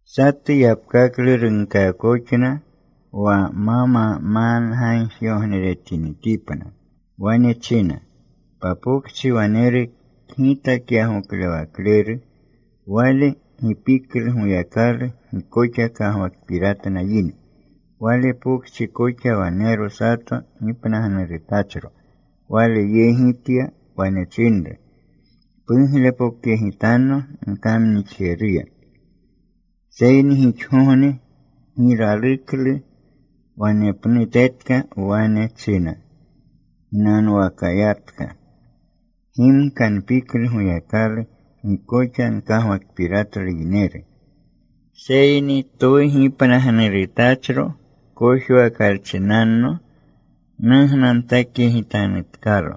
Satu yapkaklu runkaakoxna wa ma mamanga gagjigogneretinitipna. Wane china, “Papokchi waneru kgitakyagoklewakleru. Wale gi piklu Goyakalu. Gi koxa kagwakpiratna yine. Wale pokchi koxa wanero sato gipnagnurutachro. Wale yegi tya. Wane chinru, ‘Puglepokyegitanno nkamnixjeruya.’ “Seyni gixgogne gi raluklu. Wanepnutetka wane china ginanwakayatka, ‘Gimka npiklu Goyakalu. Gi koxa nkagwakpiratlu yineru. Seyni twu gipnagnurutachro kojwakalchinanno nugnapokyegitanutkalo.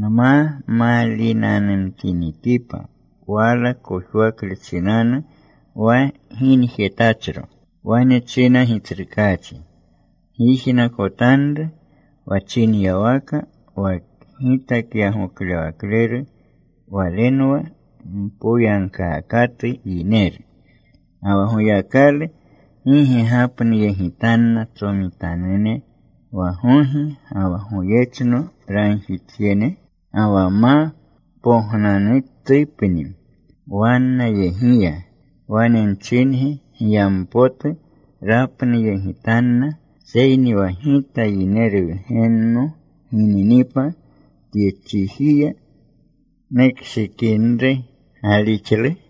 Nma maalinanumtinitipa wala kojwakle chinanu wa ginjetachro.’” Wane china Gitsrukaachi, “Gyijnakotanru wa chinyawaka wa kgitakyagoklewakleru. Walenwa mpoyagkaakatu yineru. Ga wa Goyakalu ¿gi ge gapnuyegitanna tsomitanune wa gogi ga wa goyechno ragjitjene? Ga wa ma pognanutupni wannayegiya. Wane nchingi, giyampotu rapnuyegitanna. Seyni wa Gita Yineru Wgenno gininipa tye chijiya ¿nukshikinri galixlu?”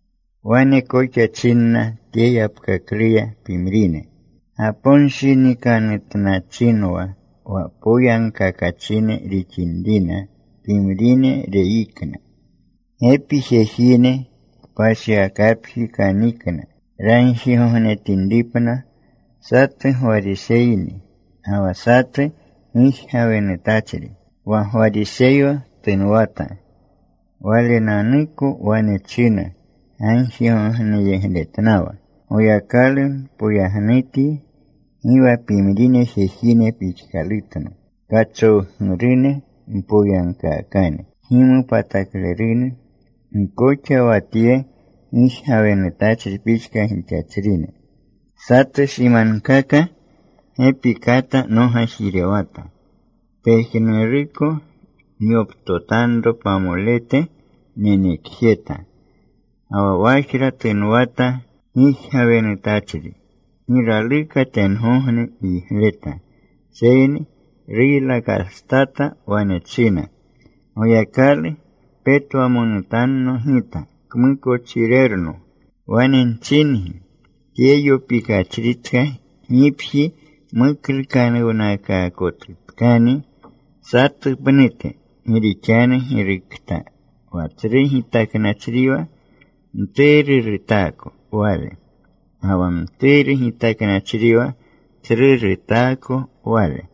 Wane koxa chinna tye yapkakluya pimrine gaponshinikanutnachinwa wa poyagkakachine rixinrina; pimrine reyikna: “Gepi jejine kpashiwakapji kanikna ragjigognetinripna. Satu Gwariseyni, ga wa satu gijgawenutachri. Wa Gwariseyo tunwata. Walenanuko wane china gagjigogneyegletnawa, ‘Goyakalu, npoyagnutyi gi wa pimrine jejine pixkalutno, kachowgurune, mpoyagkaakane, kgimopataklerune. Gi koxa wa tye gijgawenutachri pixka gixachrino. Satu simankaka gepi kata nogajirewjeta. Pejnuruko nyoptotanro pamolete nenekjeta.’ “Ga wa wajra tunwata gijgawenutachri. Gi raluka tengogne yigleta. Seyni ruylakastata. Wane china, ‘Goyakalu, petwamonutanno gita kmukochirerno.’ “Wane nchingi, tye yopikachritka gipji muklukanuwnakaakotutkani satu pnute. Gi rixanu girukokta wa tsru gitaknachriwa mturu rutaako wale. Ga wa mturu gitaknachriwa tsru rutaako wale.”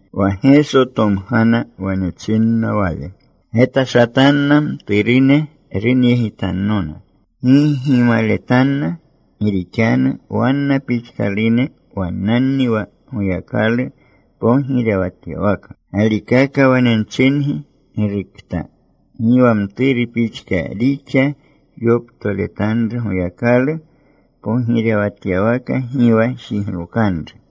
Wa Geso tomgana. Wane chinna Wale, “Getashatanna mturune runyegitannona. Gi gimaletanna. Gi rixanu wanna pixkalune wannanni wa Goyakalu pogirewatyawaka. Galikaka wane nchingi, girukokta gi wa mturu pixka rixyoptoletanru Goyakalu pogirewatyawaka gi wa jiglokanru.”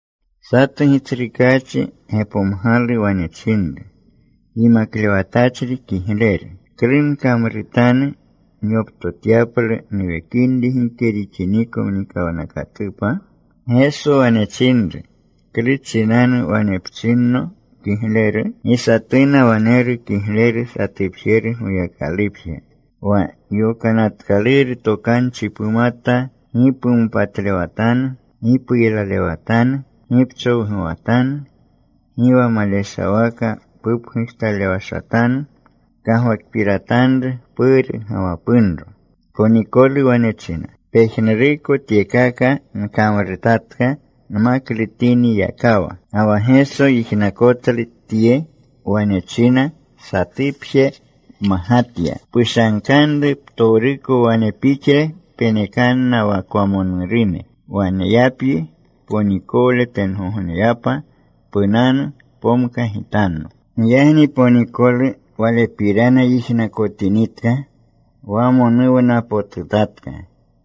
Satu gitsrukaachi gepomgalu. Wane chinru, “Yimaklewatachri kigleru, ¿klu nkamrutanu nyoptotyaplu nuwekinri gike rixiniko mnikawnakatupa?” Geso wane chinru, “¿Klu chinanu wane pchinno kigleru? Gi satuna waneru kigleru. Satupjeru, Goyakalupje. Wa Yokanatkaluru Tokanchi pumata: Gi pumopatlewatanu. Gi puylalewatanu. Gi pchowguwatanu. Gi wa maleshawaka pupgujtalewashatanu. Pkagwakpiratanru puru ga wa punro.” Ponikolu wane china, “Pejnuruko tyekaka nkamrutatka nmaklutinwakawa.” Ga wa Geso yijnakotlu tye. Wane china, “Satupje pmagatya. Pushankanru ptowruko wane pixle. Penekanna wa kwamonurune. Waneyapyi ponikole tengogneyapa. Punanu. Pomkagitanno.” Giyagni ponikolu, walepirana yijnakotinitka, wamonuwnapotutatka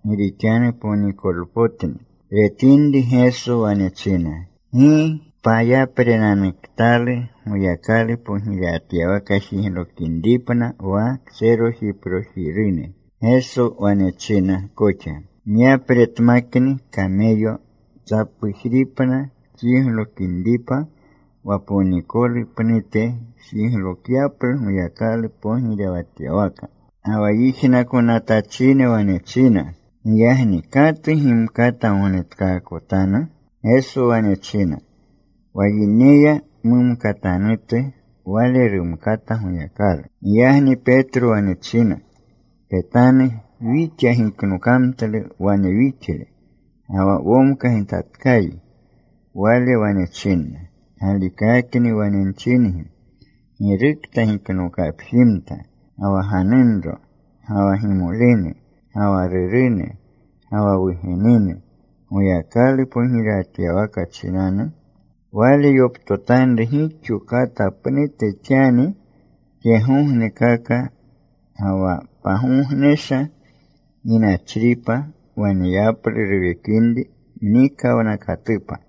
gi rixanu ponikolpotni. Retinri Geso, wane china, “¡Gi pakyaprenunanuktalu Goyakalu pogirewatyawaka jiglokinripna wa kserojiprojirune!” Geso wane china koxa, “Myapretmakni kameyo tsapujripna tjiglokinripa wa ponikolu pnute jiglokyaplu Goyakalu pogirewatyawaka.” Ga wa yijnakonatachine wane china, “Giyagni ¿katu gimkata gognetkaakotanu?” Geso wane china, “Wa yineya mumkatanutu, wale rumkata Goyakalu.” Giyagni Petro wane china, “Petanu. Wixa giknokamtlu wane wixle. Ga wa womkagitatkayi.” Wale wane chinna, “Galikakni wane nchingi, girukokta giknokapjimta, ga wa ganunro, ga wa gimolene, ga wa rurune, ga wa wugenene Goyakalu pogirewatyawaka chinanu, wale yoptotanru gixo kata pnute xani tyegognekaka, ga wa pagognesha ginachripa waneyaplu ruwekinri mnikawnakatupa.”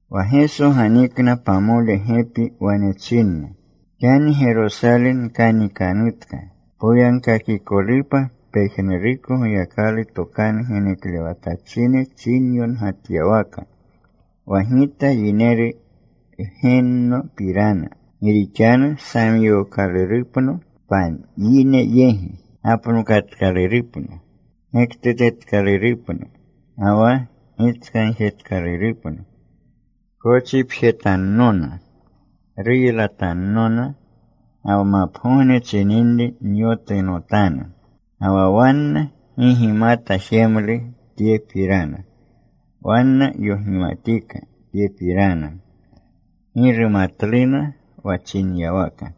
Wa Geso ganikna pamole gepi. Wane chinna, “Xani Gerosale wkanikanutka, poyagkakikolupa pejnuruko Goyakalu tokanu geneklewatachine chinyongatyawaka wa Gita Yineru Wgennopirana. Gi rixanu samyookalurupno payine yegi. Gapnokatkalurupno. Gektutetkalurupno. Ga wa gitskagjetkalurupno. Kochipjetannona. Ruylatannona. Ga wa mapgogne chininri nyotunotanu.” Ga wa wanna gi gimata jemlu tyepirana. Wanna yogimatika tyepirana. Gi rumatluna wa chinyawaka.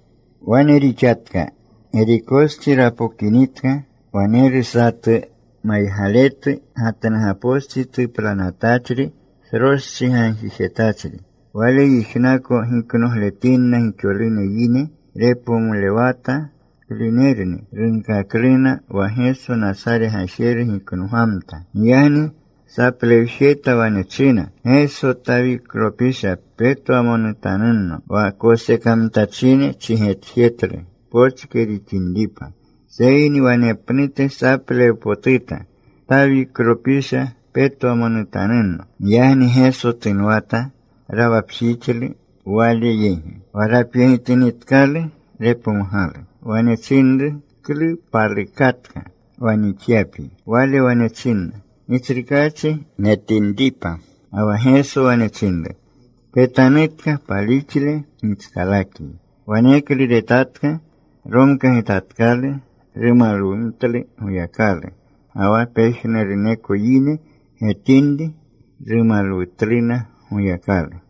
Wane rixatka. Gerikostsi rapokinitka, waneru satu maygaletu. Gatnugapostsi tuplanatachri. Sroschi gagjijetachri. Wale yijnako giknogletinna gixolune yine. Repomlewata klunerni. Runkakluna wa Geso Nasare Gajeru giknogamta. Giyagni saplewjeta. Wane china, “Geso, Tawiklopisha, petwamonutanunno.” Wa kosekamtachine chigetjetlu pochke rixinripa. Seyni wanepnute saplewjepotuta, “Tawiklopisha, petwamonutanunno.” Giyagni Geso tunwata. Rawapjixlu Wale yegi. Wa rapyegitinitkalu, repomgalu. Wane chinru, “¿Klu palukatka wa nixyapyi?” Wale wane china, “Gitsrukaachi, netinripa.” Ga wa Geso wane chinru, “Petanutka. Palixle gitskalakyi.” Waneklu retatka. Romkagitatkalu. Rumalwumtlu Goyakalu. Ga wa pejnuruneko yine getinri rumalwutluna Goyakalu.